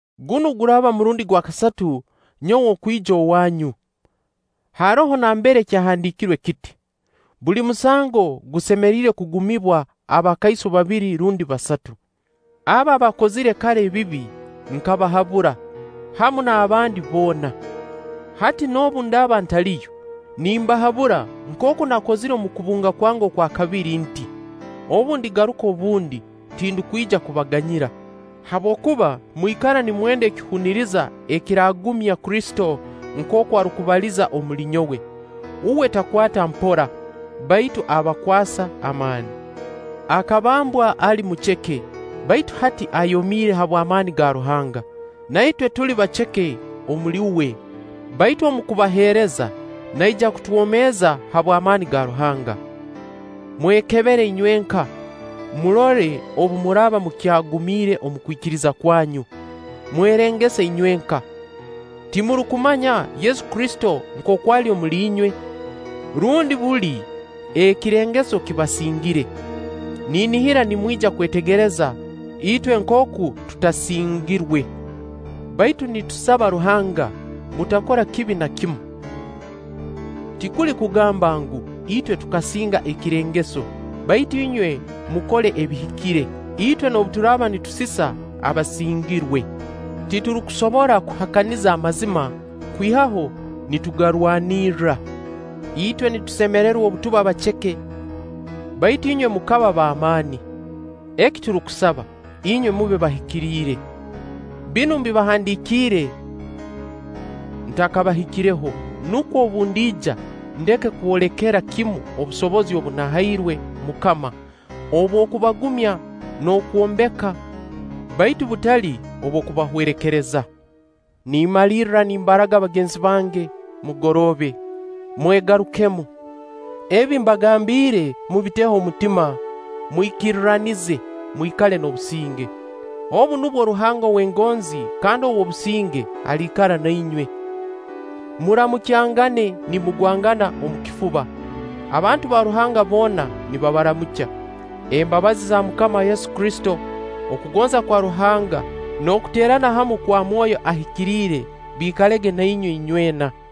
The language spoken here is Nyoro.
Gunu guraaba murundi gwa kasatu nyowe okwija owaanyu. Haroho nambere kyahandiikirwe kiti: “Buli musango gusemeriire kugumibwa abakaiso babiri rundi basatu.” Abo abaakozire kara ebibi nkabahabura, hamu n'abandi boona. Hati noobu ndaaba ntaliyo, nimbahabura nkooku naakozire omu kubunga kwange okwa kabiri nti: Obu ndigaruka obundi, tindukwija kubaganyira habwokuba mwikara nimwenda ekihuniriza ekiraagumya Kristo nkooku arukubaliza omuli nyowe. Uwe takwata mpora, baitu abakwasa amaani. Akabambwa ali muceke, baitu hati ayomiire habw'amaani ga Ruhanga. Na itwe tuli baceke omuli uwe, baitu omu kubaheereza, naija kutwomeeza habw'amaani ga Ruhanga. Mwekebere inywenka, murole obu muraaba mukyagumiire omu kwikiriza kwanyu. Mwerengese inywenka. timurukumanya Yesu Kristo nkooku ali omuli inywe? Rundi buli, ekirengeso kibasingire! Ninihira nimwija kwetegereza itwe nkooku tutasingirwe. Baitu nitusaba Ruhanga mutakora kibi na kimu. tikuli kugamba ngu, itwe tukasinga ekirengeso, baitu inywe mukole ebihikire, itwe noobu turaaba nitusisa abasingirwe. Titurukusobora kuhakaniza amazima, kwihaho nitugarwanirra. Itwe nitusemererwa obu tuba baceke, baitu inywe mukaba b'amaani. eki turukusaba, inywe mube bahikiriire. Binu mbibahandiikiire ntakabahikireho, nukwo obu ndiija ndeke kwolekera kimu obusobozi obu nahairwe MUKAMA obw'okubagumya n'okwombeka, baitu butali obw'okubahwerekereza. Nimmalirra nimbaraga bagenzi bange, mugoroobe. Mwegarukemu. Ebi mbagambiire mubiteho omutima, mwikirranize, mwikale n'obusinge. Obu nubwo Ruhanga ow'engonzi kandi ow'obusinge aliikara na inywe. Muramukyangane nimugwangana omu kifuba. Abantu ba Ruhanga boona nibabaramukya. Embabazi za MUKAMA Yesu Kristo, okugonza kwa Ruhanga, n'okuteerana hamu kwa Mwoyo Ahikiriire biikalege na inywe inywena.